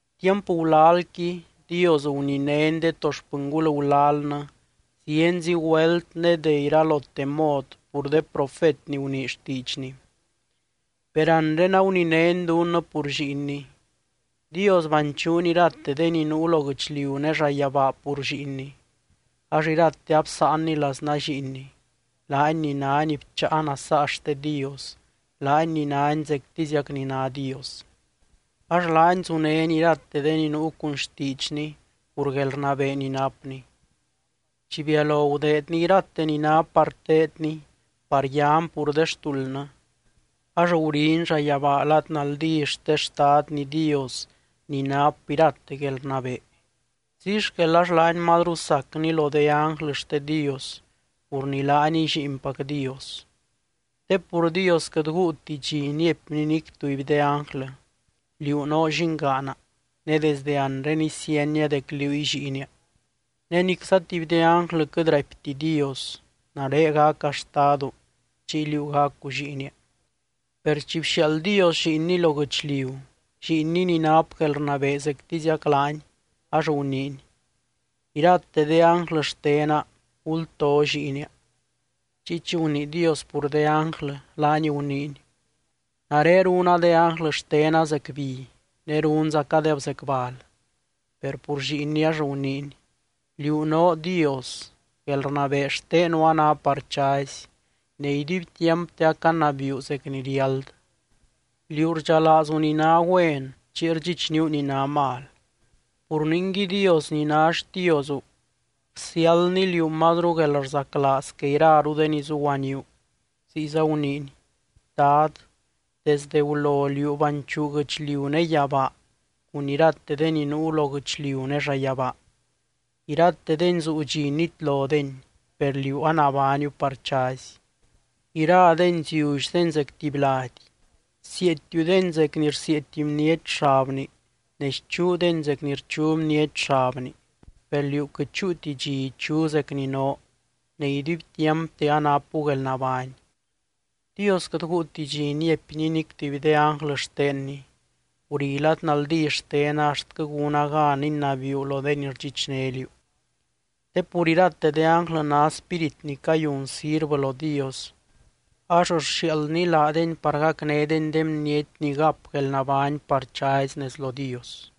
Tiamp gulalqui, Dios guninény de to xpɨngul gulalnɨ zienzi güelt ne de iralote mod pur de profet ni gunii xtiidxny, per anre aguninény dunnɨ pur Lliinny. Dios banchuuny irate de ni nuu lo guɨchliu ne llayabaa pur Lliinny. Ax irate absáanny laznaa Lliinny, laany ni nány bcháa nasaa xte Dios, laany ni nány zectiziac ni ná Dios. Ax laany zunény irate de ni nuu cun xtiidxny pur guelrnabee ni napny. Chi bialo gudeedny irate ni ná par teedny par yan pur de xtuldnɨ, ax guriny llayabaa lad naldí xte Xtadny Dios ni nap irate guelrnabee. Ziy xquel ax laany mazru sacny lo de ánglɨ xte Dios pur ni laaniy Lliinpac Dios. Te pur Dios quɨt guuti dxi niaipny nic tuby de ánglɨ: Liú noo llingaana, ne desde anre isienia dec liúy Lliinia. Ne nicza tuby de ánglɨ quɨt raipti Dios: Nare gaca Xtadu, chiy liú gacu lliinia. Per chi bxiaald Dios Lliinny lo guɨchliu, Lliinny ni nap guelrnabee zectiziac laany, ax guniiny: Irate de ánglɨ xtena, gulto Lliinia. Chiy chi gunii Dios pur de ánglɨ, laany guniiny: Nare runa de ánglɨ xtena zec bi, ne runzacadeb zec bal. Per pur Lliinny ax guniiny: Liú noo Dios. Guelrnabee xtenu a ná par chazy, ne iduibtiampte acanabiiu zec ni riáld. Liú rdxalaazu ni ná güen chiy rdxichníu ni ná mal. Pur ningui, Dios ni ná xtiozu bsiáldny liú mazru guelrzaclaaz que iraru de ni zuguaníu. Ziyza guniiny: Dad, desde gulo Liú banchuu guɨchliu ne yabaa cun irate de ni nuu lo guɨchliu ne llayabaa. Iratedeni zuu dxi nitlodeni, per liú anabániu par chazy. Iradeni ziullydeni zec tuby lady; Sieetiudeni zec ni rsieety bniety xabni, ne schuudeni zec ni rchu bniety xabni. Per liú quɨt chúuti dxi ichu zec ni noo, ne iduibtiampte anapu guelnabány. Dios quɨt guuti dxi niaipny nic tuby de ánglɨ xtenny: Guri lad naldí xtena axtquɨ gúna gan inabiiu lo de ni rdxichné liú. Te pur irate de ánglɨ ná spírit ni cayun sirvɨ lo Dios, ax rxiaaldny laadeny par gacnédeny de bniety ni gap guelnabány par chazy nez lo Dios.